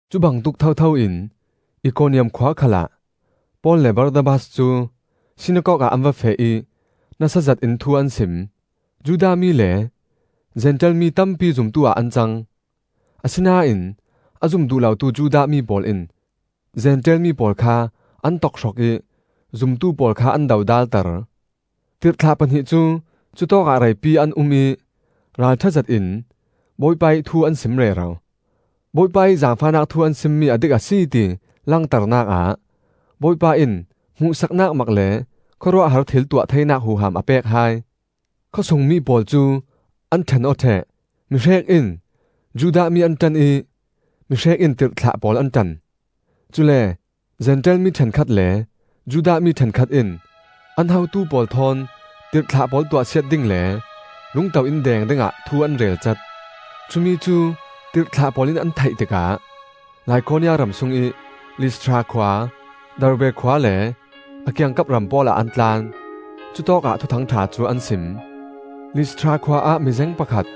Cubangtuk thotho in Ikoniam khua khalah Paul le Barnabas cu sinakok ah an va feh ih nasa zetin thu an sim. Judah mi le Zentail mi tampi zumtu-ah an cang. Asinain a zum duh lotu Judah mi pawl in Zentail mi pawl kha an tokhrok ih zumtu pawl kha an dodalter. Tirhthlah pahnih cu cutawkah reipi an um ih ralṭha zetin Bawipa ih thu an sim rero. Bawipa ih zaangfahnak thu an simmi a dik a si, ti langternak ah Bawipa in hmuhsaknak mak le khawruahhar thil tuah theinak huham a pek hai. Khawsung mi pawl cu an ṭhen aw ṭheh. Mihrek in Judah mi an ṭan ih mihrek in tirhthlah pawl an ṭan. Cule Zentail mi ṭhenkhat le Judah mi ṭhenkhat in an hotu pawl thawn tirhthlah pawl tuahsiat ding le lungto in deng dingah thu an relcat. Cumi cu tirhthlah pawl in an theih tikah Likaonia ram sungih Listra khua, Derbe khua le a kiangkap ram pawl ah an tlan. Cutawkah Thuthang ṭha cu an sim. Listra khua ah mizeng pakhat,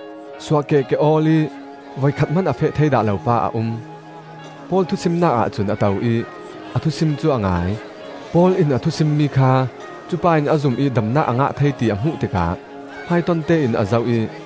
suahkeh ke-awl ih voikhat hman a feh thei dah lo pa a um. Paul thusimnak ahcun a to ih a thusim cu a ngai. Paul in a thusimmi kha cupa in a zum ih damnak a ngah thei ti a hmuh tikah hmaitontein a zoh ih,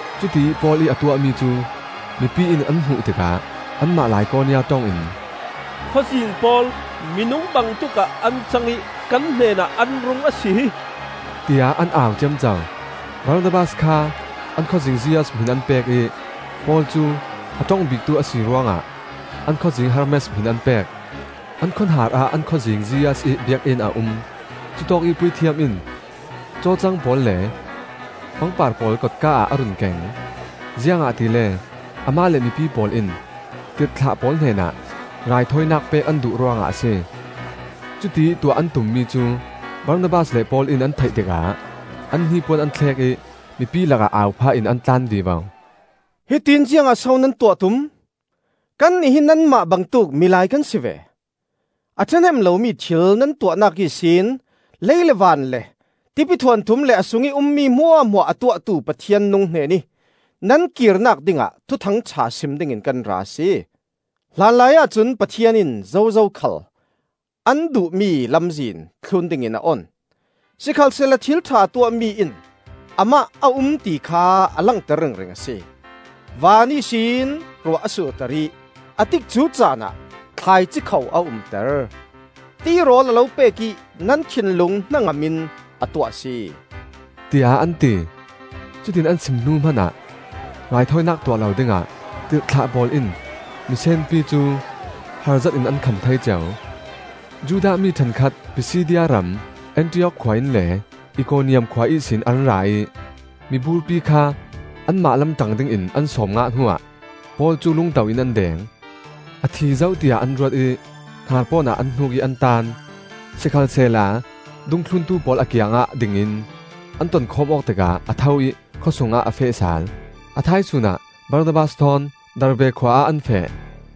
Cutiih Paul ih a tuahmi cu mipi in an hmuh tikah anmah Likaonia ṭong in, “Khawzing pawl minung bangtuk ah an cang ih kan hnenah an rung a si hi!” tiah an au ciamco. Barnabas kha an khawzing Zeus hmin an pek ih Paul cu a ṭong biktu a si ruangah an khawzing Hermes hmin an pek. An khuahnar ah an khawzing Zeus ih biakinn a um; cutawkih puithiam in cawcang pawl le pangpar pawl kotka ah a run keng, ziangahtile amah le mipi pawl in tirhthlah pawl hnenah raithawinak pek an duh ruangah a si. Cutiih tuah an tummi cu Barnabas le Paul in an theih tikah an hnipuan an thlek ih mipi lakah au phah in an tlan vivo. “Hitiin ziangah so nan tuah tum? Kannih hi nanmah bangtuk milai kan si ve! A ṭhahnem lomi thil nan tuahnak ihsin lei le van le tipithuanthum le a sungih ummi hmuahhmuah a tuahtu Pathian nung hnenih nan kirnak dingah Thuthang ṭha sim dingin kan ra a si. Hlanlaiah cun Pathian in zozo khal an duhmi lamzin thlun dingin a on. Sikhalsehla thilṭha a tuahmi in amah a um ti kha a langter ringring a si: van ihsin ruah a surter ih a tikcu caan ah thlaici kho a umter; tirawl a lo pek ih nan thinlung hnangam in a tuah a si,” tiah an ti. Cutiin an sim hnu hmanah raithawinak tuah lo dingah tirhthlah pawl in misenpi cu har zetin an kham thei ceu. Judah mi ṭhenkhat Pisidia ram Antiok khua in le Ikoniam khua ihsin an ra ih miburpi kha anmah lam ṭang dingin an sawm ngah hnuah Paul cu lungto in an deng; a thi zo tiah an ruat ih hnarpawn ah an hnuk ih an taan. Sikhalsehla dungthluntu pawl a kiangah ding in an tonkhawm awk tikah a tho ih khawsungah a feh sal. A thaisun ah Barnabas thawn Derbe khua ah an feh.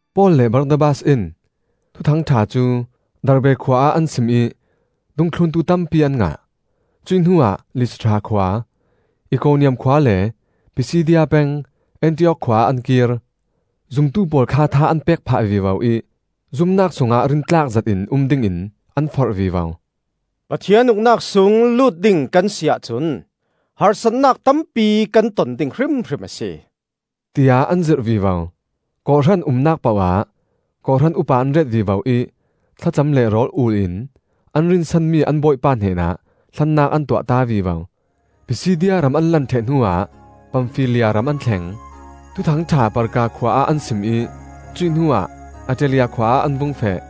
Paul le Barnabas in Thuthang ṭha cu Derbe khua ah an sim ih dungthluntu tampi an ngah. Cuih hnuah Listra khua, Ikoniam khua le Pisidia peng Antiok khua ah an kir. Zumtu pawl kha tha an pek phah vivo ih zumnak sungah rintlak zetin um dingin an forh vivo. “Pathian Uknak sung lut ding kan si ahcun harsatnak tampi kan ton ding hrimhrim a si,” tiah an zirh vivo. Kawhhran umnak poh ah kawhhran upa an ret vivo ih thlacam le rawl-ul in an rinsanmi an Bawipa hnenah hlannak an tuahta vivo. Pisidia ram an lan ṭheh hnuah Pamfilia ram an thleng. Thuthang ṭha Perga khua ah an sim ih cuih hnuah Attalia khua ah an vung feh.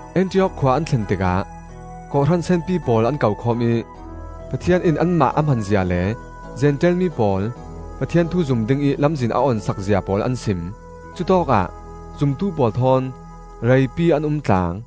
Antiok khua an thlen tikah kawhhran senpi pawl an kokhawm ih Pathian in anmah a hmanzia le Zentail mi pawl Pathian thu zum dingih lamzin a on sakzia pawl an sim. Cutawkah zumtu pawl thawn reipi an um tlang.